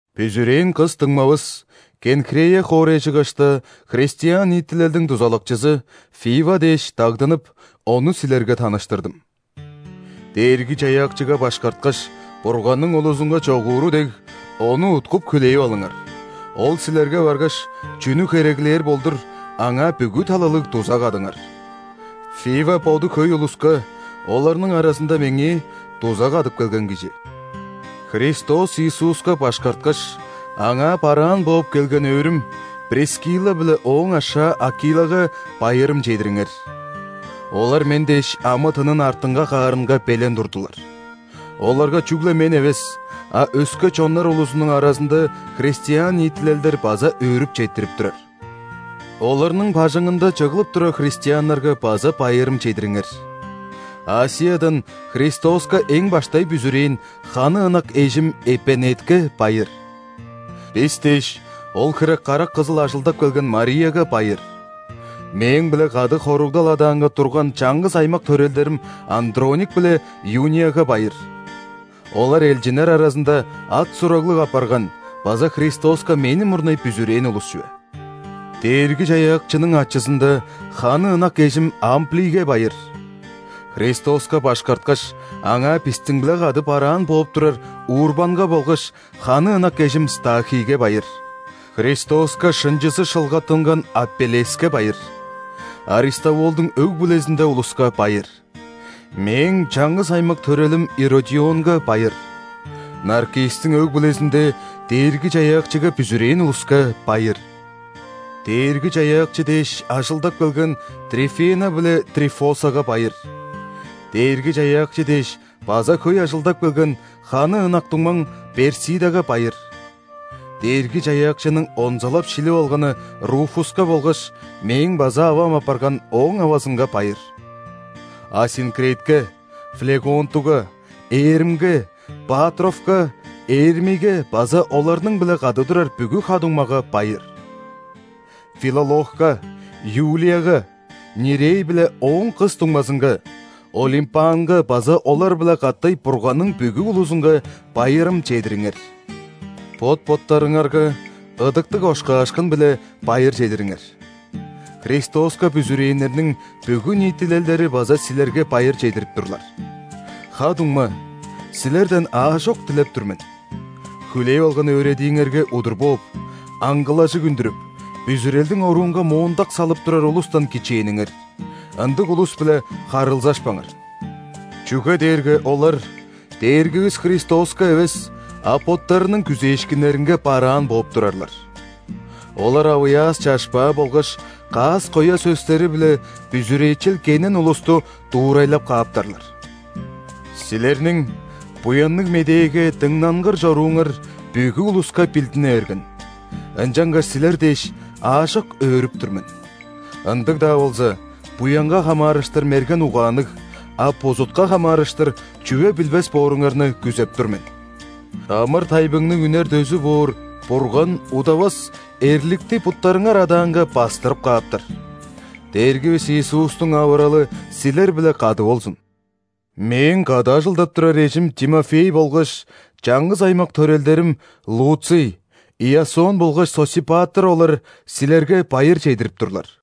Бүзүрээн кыс дуңмавыс, Кенхрея хоорайжыгашта христиан ниитилелдиң дузалакчызы Фива дээш дагдынып, ону силерге таныштырдым. Дээрги-Чаяакчыга башкарткаш, Бурганның улузунга чогууру дег, ону уткуп хүлээп алыңар, ол силерге баргаш, чүнү хереглээр болдур, аңаа бүгү талалыг дуза кадыңар. Фива боду хөй улуска, оларның аразында меңээ, дуза кадып келген кижи. Христос Иисуска башкарткаш, Аңаа бараан бооп келген өөрүм – Прискилла биле ооң ашаа Акилага байырым чедириңер. Олар мен дээш амы-тынын артынга каарынга белен турдулар. Оларга чүгле мен эвес, а өске чоннар улузунуң аразында христиан ниитилелдер база өөрүп четтирип турар. Оларның бажыңында чыглып турар христианнарга база байырым чедириңер. ·Асиядан Христоска эң баштай бүзүрээн ханы ынак эжим Эпенетке байыр. Бис дээш, ол хире карак кызыл ажылдап келген Марияга байыр. Мээң-биле кады хоругдал адаанга турган чаңгыс аймак төрелдерим Андроник биле Юнияга байыр. Олар элчиннер аразында ат-сураглыг апарган база Христоска мени мурнай бүзүрээн улус чүве. Дээрги-Чаяакчының ачызында ханы ынак эжим Амплийге байыр. Христоска башкарткаш, Аңаа бистиң-биле кады бараан бооп турар Урбанга болгаш ханы ынак эжим Стахийге байыр. Христоска шынчызы шылгаттынган Апеллеске байыр. Аристовулдуң өг-бүлезинде улуска байыр. Мээң чаңгыс аймак төрелим Иродионга байыр. Наркисстиң өг-бүлезинде Дээрги-Чаяакчыга бүзүрээн улуска байыр. Дээрги-Чаяакчы дээш ажылдап келген Трифена биле Трифосага байыр. Дээрги-Чаяакчы дээш база хөй ажылдап келген ханы ынак дуңмам Персидага байыр. Дээрги-Чаяакчының онзалап шилип алганы Руфуска болгаш мээң база авам апарган ооң авазынга байыр. Асинкритке, Флегонтуга, Эрмге, Патровка, Эрмийге база оларның-биле кады турар бүгү ха-дуңмага байыр. Филологка, Юлияга, Нирей биле ооң кыс дуңмазынга, Олимпанга база олар-биле катай Бурганның бүгү улузунга байырым чедириңер. Бот-боттарыңарга ыдыктыг ошкаашкын-биле байыр чедириңер. Христоска бүзүрээннерниң бүгү ниитилелдери база силерге байыр чедирип турлар. Ха-дуңма, силерден аажок дилеп тур мен: хүлээп алган өөредииңерге удур бооп: аңгылажыг үндүрүп, бүзүрелдиң оруунга моондак салып турар улустан кичээниңер. Ындыг улус-биле харылзашпаңар. Чүге дээрге олар Дээргивис Христоска эвес, а боттарының күзээшкиннеринге бараан бооп турарлар. Олар авыяас-чашпаа болгаш каас-коя сөстери-биле бүзүрээчел кенен улусту дуурайлап кааптарлар. Силерниң Буянныг Медээге дыңнангыр чорууңар бүгү улуска билдине берген, ынчангаш силер дээш, аажок өөрүп тур мен. Ындыг-даа болза, буянга хамаарыштыр мерген угаанныг, а бузутка хамаарыштыр чүве билбес бооруңарны күзеп тур мен. Амыр-тайбыңның үнер дөзү боор Бурган удавас эрликти буттарыңар адаанга бастырып кааптар. Дээргивис Иисустуң авыралы силер-биле кады болзун. Мээң кады ажылдап турар эжим Тимофей болгаш чаңгыс аймак төрелдерим Луций, Иасон болгаш Сосипатр олар силерге байыр чедирип турлар.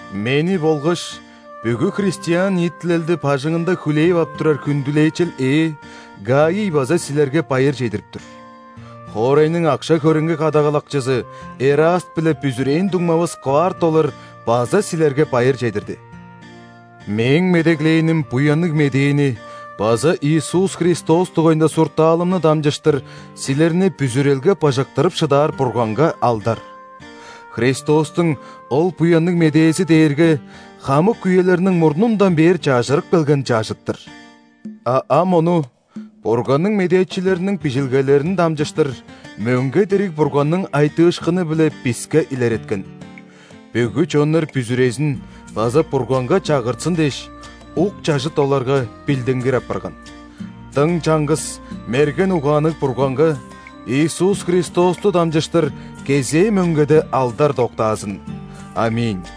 Мени болгаш бүгү христиан ниитилелди бажыңында хүлээп ап турар хүндүлээчел ээ Гаий база силерге байыр чедирип тур. Хоорайның акша-хөреңги кадагалакчызы Эраст биле бүзүрээн дуңмавыс Кварт олар база силерге байыр чедирди. Мээң медеглээним Буянныг Медээни база Иисус Христос дугайында суртаалымны дамчыштыр силерни бүзүрелге быжыктырып шыдаар Бурганга алдар. Христостуң ол Буянныг Медээзи дээрге хамык үелерниң мурнундан бээр чажырып келген чажыт-тыр, а ам ону Бурганның медээчилериниң Бижилгелерин дамчыштыр, мөңге дириг Бурганның айтыышкыны-биле биске илереткен. Бүгү чоннар бүзүрезин база Бурганга чагыртсын дээш, ук чажыт оларга билдингир апарган. Дың чаңгыс мерген угаанныг Бурганга Иисус Христосту дамчыштыр кезээ мөңгеде алдар доктаазын! ·Аминь.